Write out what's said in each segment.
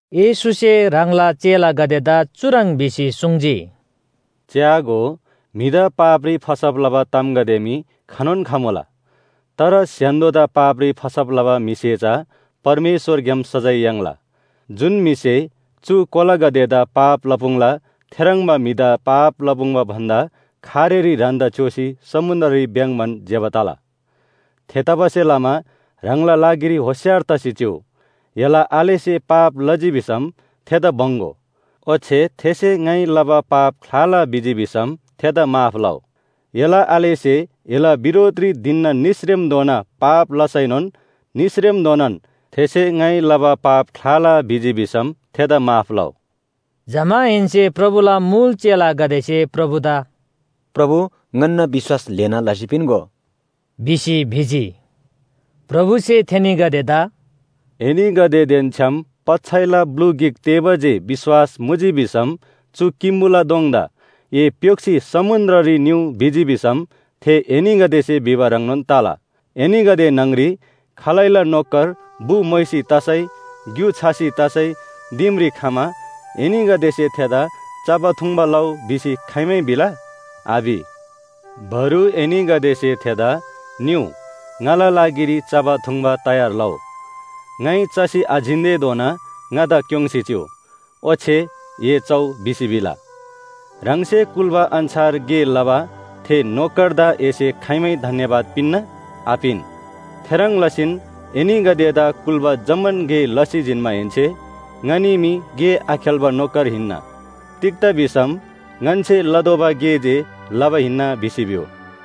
येशूसे ह्राङला चेलागदेदा चुह्रङ् भिसी सुङ्जी, “च्‍यागो, म्‍हिदा पापरी फसब लबा तामगदे मी खनोन खमुला। तर स्‍य्‍हान्‍दोदा पापरी फसब लबा म्‍हिसे चा परमेश्‍वरग्‍याम सजाय याङ्ला। जुन म्‍हिसे चु कोलागदेदा पाप लपुङ्ला थेह्रङ्बा म्‍हिदा पाप लपुङ्बा भन्‍दा खारेरी ह्रान्‍दा च्‍योसी समुन्‍द्ररी भ्‍याङ्‍बान ज्‍यबा तला। थेतबासेलमा ह्राङला लागिरी होशियार तसी चिउ! एला आलेसे पाप लजी भिसम थेदा बङ्‍‌गो। ओच्‍छे थेसे ङाइ लबा पाप ख्‍लाला भिजी भिसम थेदा माफ लउ। एला आलेसे एला बिरोधरी धिनना निसरेमधोना पाप लसैनोन निसरेमधोनान थेसे ङाइ लबा पाप ख्‍लाला भिजी भिसम थेदा माफ लउ।” जमाहेन्‍से प्रभुला मुल चेलागदेसे प्रभुदा “प्रभु, ङन्‍ना विश्‍वास ल्‍हेना लसी पिन्‍गो” भिसी भिजी। प्रभुसे थेनीगदेदा “एनीगदेदेन छ्‌याम पच्‍छैला ब्‍लु गिक तेःबा जे विश्‍वास मुजी भिसम चु किम्‍बुला दोङदा ‘ए प्‍योक्‍सी समुन्‍द्ररी निउ’ भिजी भिसम थे एनीगदेसे भिबा ह्रङ्नोन तला। “एनीगदे न्‍हङरी खालैला नोकर बु मोइसी तसै ग्‍यु छसी तसै दिमरी खमा, एनीगदेसे थेदा ‘चबा थुङ्बा लउ’ भिसी खाइमै भिला? आभि। बरु एनीगदेसे थेदा ‘निउ, ङाला लागिरी चबा थुङ्बा तयार लउ, ङाइ चसी आजिन्‍तेधोना ङादा क्‍योङ्सी चिउ, ओच्‍छे ए चउ’ भिसी भिला। ह्राङसे कुल्‍बा अन्‍छार गे लबा थे नोकरदा एसे खाइमै धन्‍यवाद पिन्‍ना? आपिन। थेह्रङ् लसीन एनीगदेदा कुल्‍बा जम्‍मान गे लसी जिन्‍माहेन्‍से ‘ङनी मी गे आखेल्‍बा नोकर हिन्‍ना। तिग्‍दा भिसम ङन्‍से लतोःबा गे जे लबा हिन्‍ना’ भिसी भिउ।”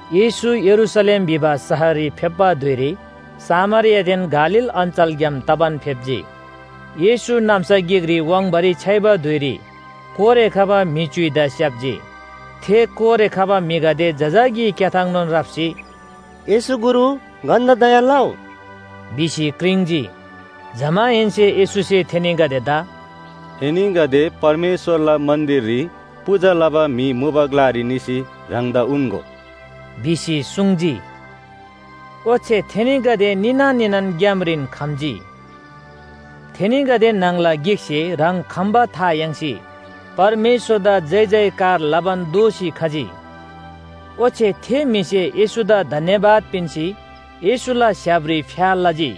येशू यरूशलेम भिबा शहररी फेप्‍बा धुइरी सामरियादेन गालील अञ्‍चलग्‍याम तबान फेप्‍जी। येशू नाम्‍सा गिकरी वाङ्बारी छ्‌याइबा धुइरी कोरे खबा म्‍हि च्‍युइदा स्‍याप्‍जी। थे कोरे खबा म्‍हिगदे जजाकी क्‍याथाङनोन राप्‍सी, “येशू गुरु, ङन्‍दा दया लउ” भिसी क्रिङ्‌जी। जमाहेन्‍से येशूसे थेनीगदेदा “एनीगदे परमेश्‍वरला मन्‍दिररी पूजा लबा म्‍हि मुबा ग्‍लारी निसी ह्राङदा उन्‍गो” भिसी सुङ्जी। ओच्‍छे थेनीगदे निना निनान ग्‍यामरीन खम्‍जी। थेनीगदे न्‍हङला गिकसे ह्राङ खम्‍बा था याङ्सी परमेश्‍वरदा जयजयकार लबान दोःसी खजी। ओच्‍छे थे म्‍हिसे येशूदा धन्‍यवाद पिन्‍सी येशूला स्‍य्‍हापरी फ्‍या लजी।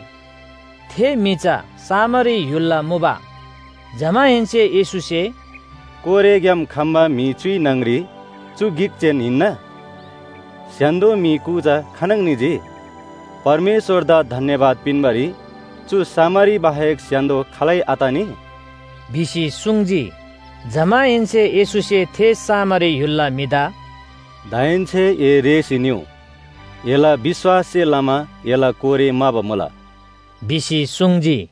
थे म्‍हि चा सामरी य्‍हुलला मुबा। जमाहेन्‍से येशूसे “कोरेग्‍याम खम्‍बा म्‍हि च्‍युइ न्‍हङरी चु गिक जेन हिन्‍ना? स्‍य्‍हान्‍दो म्‍हि कु चा खानङ निजी? परमेश्‍वरदा धन्‍यवाद पिन्‍बारी चु सामरी बाहेक स्‍य्‍हान्‍दो खालै आतनी?” भिसी सुङ्जी। जमाहेन्‍से येशूसे थे सामरी य्‍हुलला म्‍हिदा “दाहेन्‍से ए रेःसी निउ, एला विश्‍वाससे लमा एला कोरे म्‍हाबा मुला” भिसी सुङ्जी।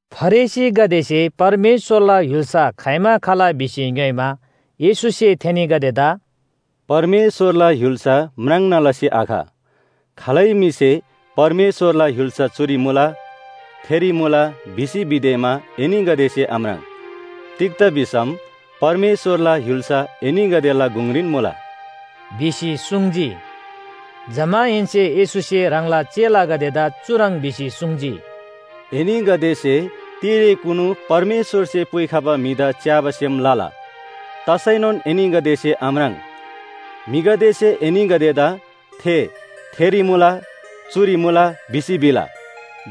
फरिसीगदेसे परमेश्‍वरला य्‍हुल्‍सा खाइमा खला भिसी ङ्‌योइमा, येशूसे थेनीगदेदा “परमेश्‍वरला य्‍हुल्‍सा म्राङ्ना लसी आख। खालै म्‍हिसे परमेश्‍वरला य्‍हुल्‍सा चुरी मुला, थेरी मुला भिसी भिदेमा एनीगदेसे आम्राङ्। तिग्‍दा भिसम परमेश्‍वरला य्‍हुल्‍सा एनीगदेला गुङरीन मुला” भिसी सुङ्जी। जमाहेन्‍से येशूसे ह्राङला चेलागदेदा चुह्रङ् भिसी सुङ्जी, “एनीगदेसे तिरेकुनु परमेश्‍वरसे पुइखबा म्‍हिदा च्‍याबा सेम लला, तसैनोन एनीगदेसे आम्राङ्। म्‍हिगदेसे एनीगदेदा थे थेरी मुला, चुरी मुला भिसी भिला,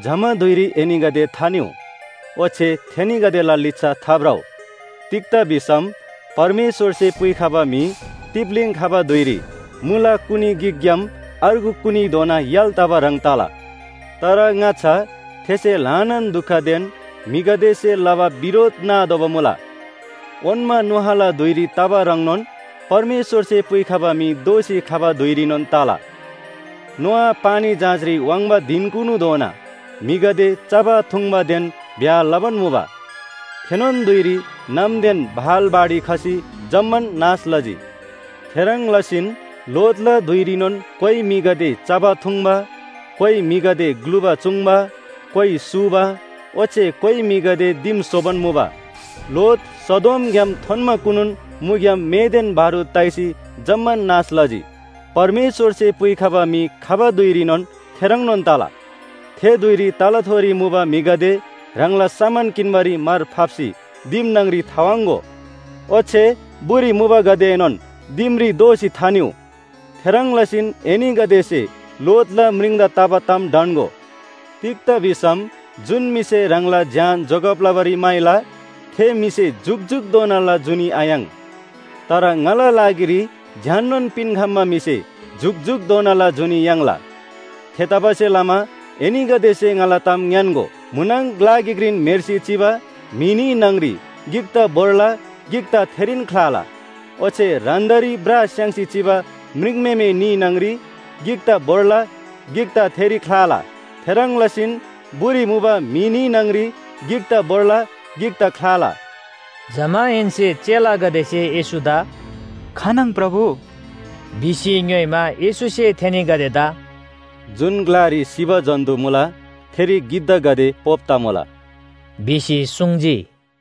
जमा धुइरी एनीगदे थानिउ ओच्‍छे थेनीगदेला लिच्‍छा थाभ्रउ। तिग्‍दा भिसम परमेश्‍वरसे पुइखबा म्‍हि तिप्‍लीङ खबा धुइरी मुला कुनी गिकग्‍याम अर्गु कुनीधोना य्‍हाल तबा ह्रङ् तला। तर ङाच्‍छा थेसे ल्‍हानान दुखदेन म्‍हिगदेसे लबा बिरोध नातोःबा मुला। “ओन्‍मा नोआला धुइरी तबा ह्रङ्नोन परमेश्‍वरसे पुइखबा म्‍हि दोःसी खबा धुइरीनोन तला। नोआ पानी जहाजरी वाङ्बा धिनकुनुधोना म्‍हिगदे चबा थुङ्बादेन ब्‍याह लबान मुबा। थेनोन धुइरी नामदेन भाल बाढी खसी जम्‍मान नाश लजी। “थेह्रङ् लसीन लोतला धुइरीनोन कोइ म्‍हिगदे चबा थुङ्बा, कोइ म्‍हिगदे ग्‍लुबा चूङ्बा, कोइ सूबा ओच्‍छे कोइ म्‍हिगदे दिम स्‍होबान मुबा। लोत सदोमग्‍याम थोन्‍माकुनुन मुग्‍याम मेदेन बारूद ताइसी जम्‍मान नाश लजी। “परमेश्‍वरसे पुइखबा म्‍हि खबा धुइरीनोन थेह्रङ्नोन तला। थे धुइरी तलाथोरी मुबा म्‍हिगदे ह्राङला सामान किन्‍बारी मार फाप्‍सी दिम न्‍हङरी थावाङ्‍गो, ओच्‍छे बुरी मुबागदेएनोन दिमरी दोःसी थानिउ। थेह्रङ् लसीन एनीगदेसे लोतला म्रिङदा तबा ताम ढन्‍गो। तिग्‍दा भिसम जुन म्‍हिसे ह्राङला ज्‍यान जोगब लबारी म्‍हाइला थे म्‍हिसे जुकजुकधोनाला जुनी आयाङ्। तर ङाला लागिरी ज्‍याननोन पिन्‍खम्‍बा म्‍हिसे जुकजुकधोनाला जुनी याङ्ला। थेतबासेलमा एनीगदेसे ङाला ताम ङ्‌यान्‍गो, म्‍हुनङ ग्‍ला गिकरीन म्‍हेर्सी चिबा म्‍हि न्‍ही न्‍हङरी गिकदा भोर्ला गिकदा थेरीन ख्‍लाला। ओच्‍छे ह्रान्‍दारी ब्रा स्‍याङ्सी चिबा म्रिङम्‍हेमे न्‍ही न्‍हङरी गिकदा भोर्ला गिकदा थेरी ख्‍लाला। थेह्रङ् लसीन बुरी मुबा म्‍हि न्‍ही न्‍हङरी गिकदा भोर्ला, गिकदा ख्‍लाला।” जमाहेन्‍से चेलागदेसे येशूदा “खानङ प्रभु?” भिसी ङ्‌योइमा, येशूसे थेनीगदेदा “जुन ग्‍लारी सिबा जन्‍तु मुला थेरी गिद्धागदे पोप तमुला” भिसी सुङ्जी।